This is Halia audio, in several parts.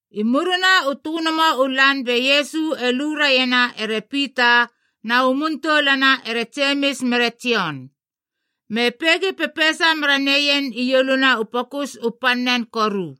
I murina u tönomo u lan be Iesu e lue raiena ere Pita, na u muntoulana ere Jemis mere Jon, me peigi pepeisa mera neien ieluna u pokus u pannen koru.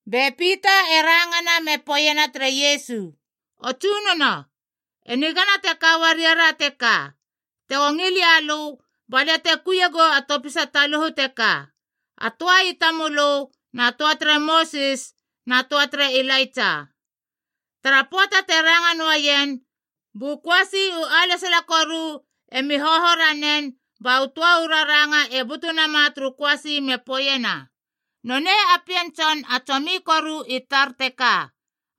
Be Pita e rangana me poeiena tere Iesu, “O Tsunono, e nigana te ka uariara teka. Tego ngil ia lö, ba lia te kuiegou a topisa taluhu teka, a töa i tamölö, na töa tere Mosis, na töa tere Ilaitsa.” Tara pöata te ranga noaien, bu köasi u alesala koru emi hoho ranen ba u töa u raranga e butu nama turu köasi me poeiena, “Nonei a Pien Tson a tsomi koru i tar teka.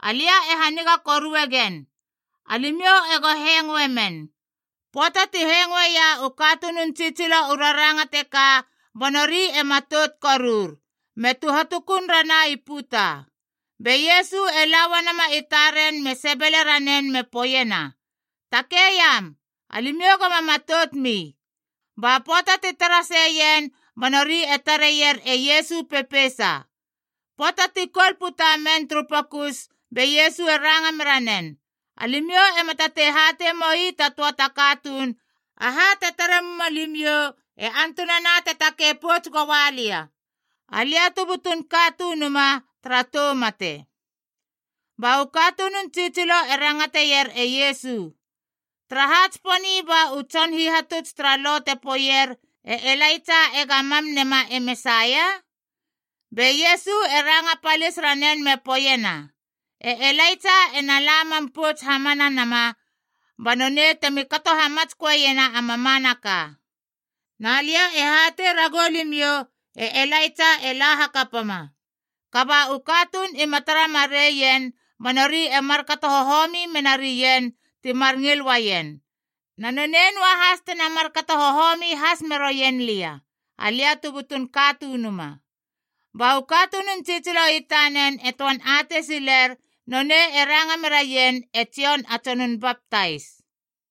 Alia e haniga korue gen. Alimiou ego hengoe men!” Pöata ti hengoeia u katunun tsitsilo u raranga teka ba nori e matout korur, me tuhatukun rana i puta. Be Iesu e la uanama i taren me sebele ranen me poeiena, “Takei iam. Alimiou goma matoutmi!” Ba pöata ti tara seien ba nori e tareier e Iesu pepeisa. Pöata ti koul puta men turu pokus be Iesu e ranga mera nen, “Alimiou ema tatei hatei moi ta töa ta katuun aha te tara muma limiou e antunana te takei pouts goa lia, Alia tu butun Katunuma, tara tou mate.” Ba u katunun tsitsilo e rangateier e Iesu, “Taraha tsiponi ba u tson hihatuts tara Lo te poeier e Elaitsa ega mam nema e Mesaia?” Be Iesu e ranga palis ranen me poeiena, “E Elaitsa ena la mam pouts hamana nama ba nonei temi kato hamatsköena a mamanaka. Na lia e hatei ragou limiou e Elaitsa e la hakapama, kaba u katuun ima tara mareien ba nori e markato hohomi menarien ti mar ngil uaien. Na nonei noahas tena markato hohomi has meroien lia, Alia tu butun Katunuma.” Ba u katunun tsitsilo i tanen e töan atei siler nonei e ranga meraien e Jon a Tsonun Baptais.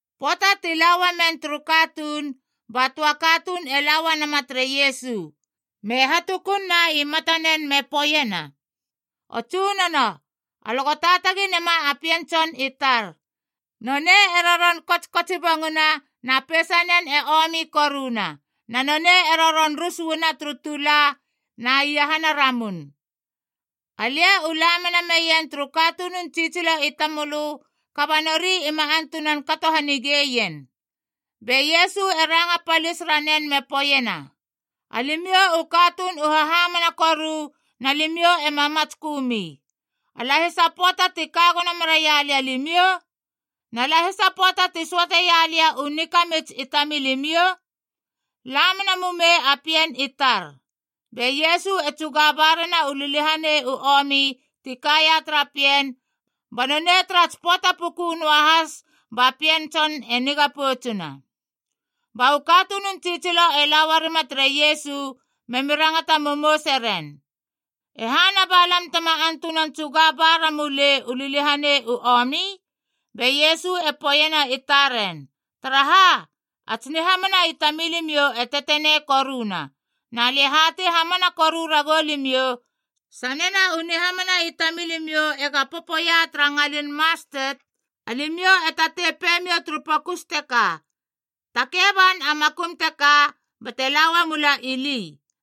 Pöata ti la uamen turu katuun, ba töa katuun e la uanama tere Iesu, me hatukunna i matanen me poeiena, “O Tsunono, alö go taatagi nema a pien tson i tar! Nonei e roron kotskotsibonguna na peisanen e omi koruna, na nonei e roron rus uana turu tula na iahana ramun. Alia u la mena meien turu katunun tsitsilo i tamölö, kaba nori ima antunan kato hanigeien.” Be Iesu e ranga palis ranen me poeiena, “Alimiou u katuun u hahamana koru na limiou ema matskömi! A lahisa pöata ti ka gono meraia lia limiou? Na lahisa pöata ti söateia lia u nikamits i tamilimiou? La mena mumei a pien i tar!” Be Iesu e tsuga barena u liliahanei u omi ti kaia tara pien, ba nonei tara tsi pöata puku noahas ba pien tson e niga poutsuna. Ba u katunun tsitsilo e la uarima tere Iesu memi rangata momouse ren, “E hana ba lam tema antunan tsuga ba ramulei u liliahanei u omi?” Be Iesu e poeiena i taren, “Taraha, a tsi nihamana i tamilimiou e tetenei koruna. Na lia e hatei hamana koru ragou limiou, Sanena u nihamana i tamilimiou ega popoia tara ngalin mastet, alimiou e tatei peimiou turu pokus teka, ‘Takei ban a makum teka bate la uamula ili,’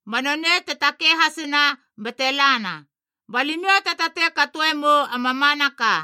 ba nonei te takei hasina bate lana. Ba limiou te tatei katoe mou a mamanaka.”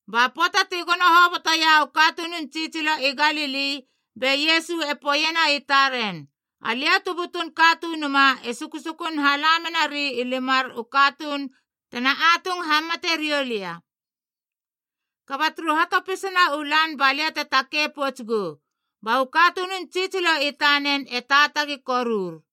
Ba pöata ti gono hobotoia u katunun tsitsilo i Galili, be Iesu e poeiena i taren, “Alia tu butun Katunuma e susukun hala menari i limar u katuun tena atung hamate riou lia. Kaba turu hatopisana u lan ba lia te takei pouts gou.” Ba u katunun tsitsilo i tanen e taatagi korur.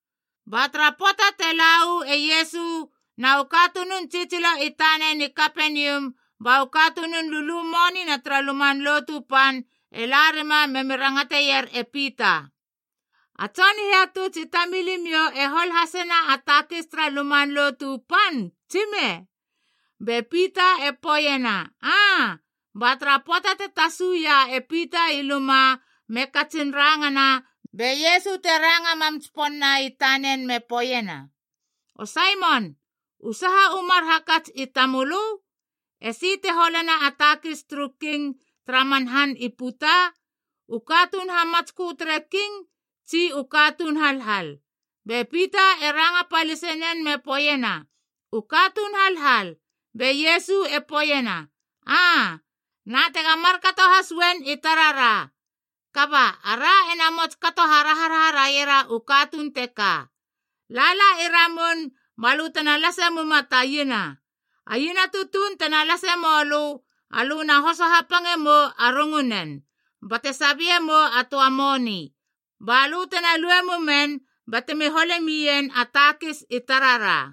Ba tara pöata te la uu e Iesu na u katunun tsitsilo i tanen i Kapenium, ba u katunun lulu monina tara Luman Lotu Pan e la rima memi rangateier e Pita, “A tson hihatuts i tamilimiou e hol hasena a takis tara Luman Lotu Pan, tsime?” Be Pita e poeiena, “Aa.” Ba tara pöata te tasuia e Pita i luma me katsin rangana, be Iesu te ranga mam tsiponna i tanen me poeiena, “O Saimon, u saha u mar hakats i tamölö? Esi te holena a takis turu king tara man han i puta? U katuun hamatskö tere king tsi u katuun halhal?” Be Pita e ranga palisenen me poeiena, “U katuun halhal.” Be Iesu e poeiena, “Aa, Na tega markato has uen i tarara. Kaba, ara ena mots kato haraharaha raiera u katuun teka. Lala i ramun balö tena lase muma ta iena. A iena tutuun tena lase mölö alö na hoso hapange mou a rungunen bate sabie mou a töa a moni, balö tena lue mumen batemi hole mien a takis i tarara.”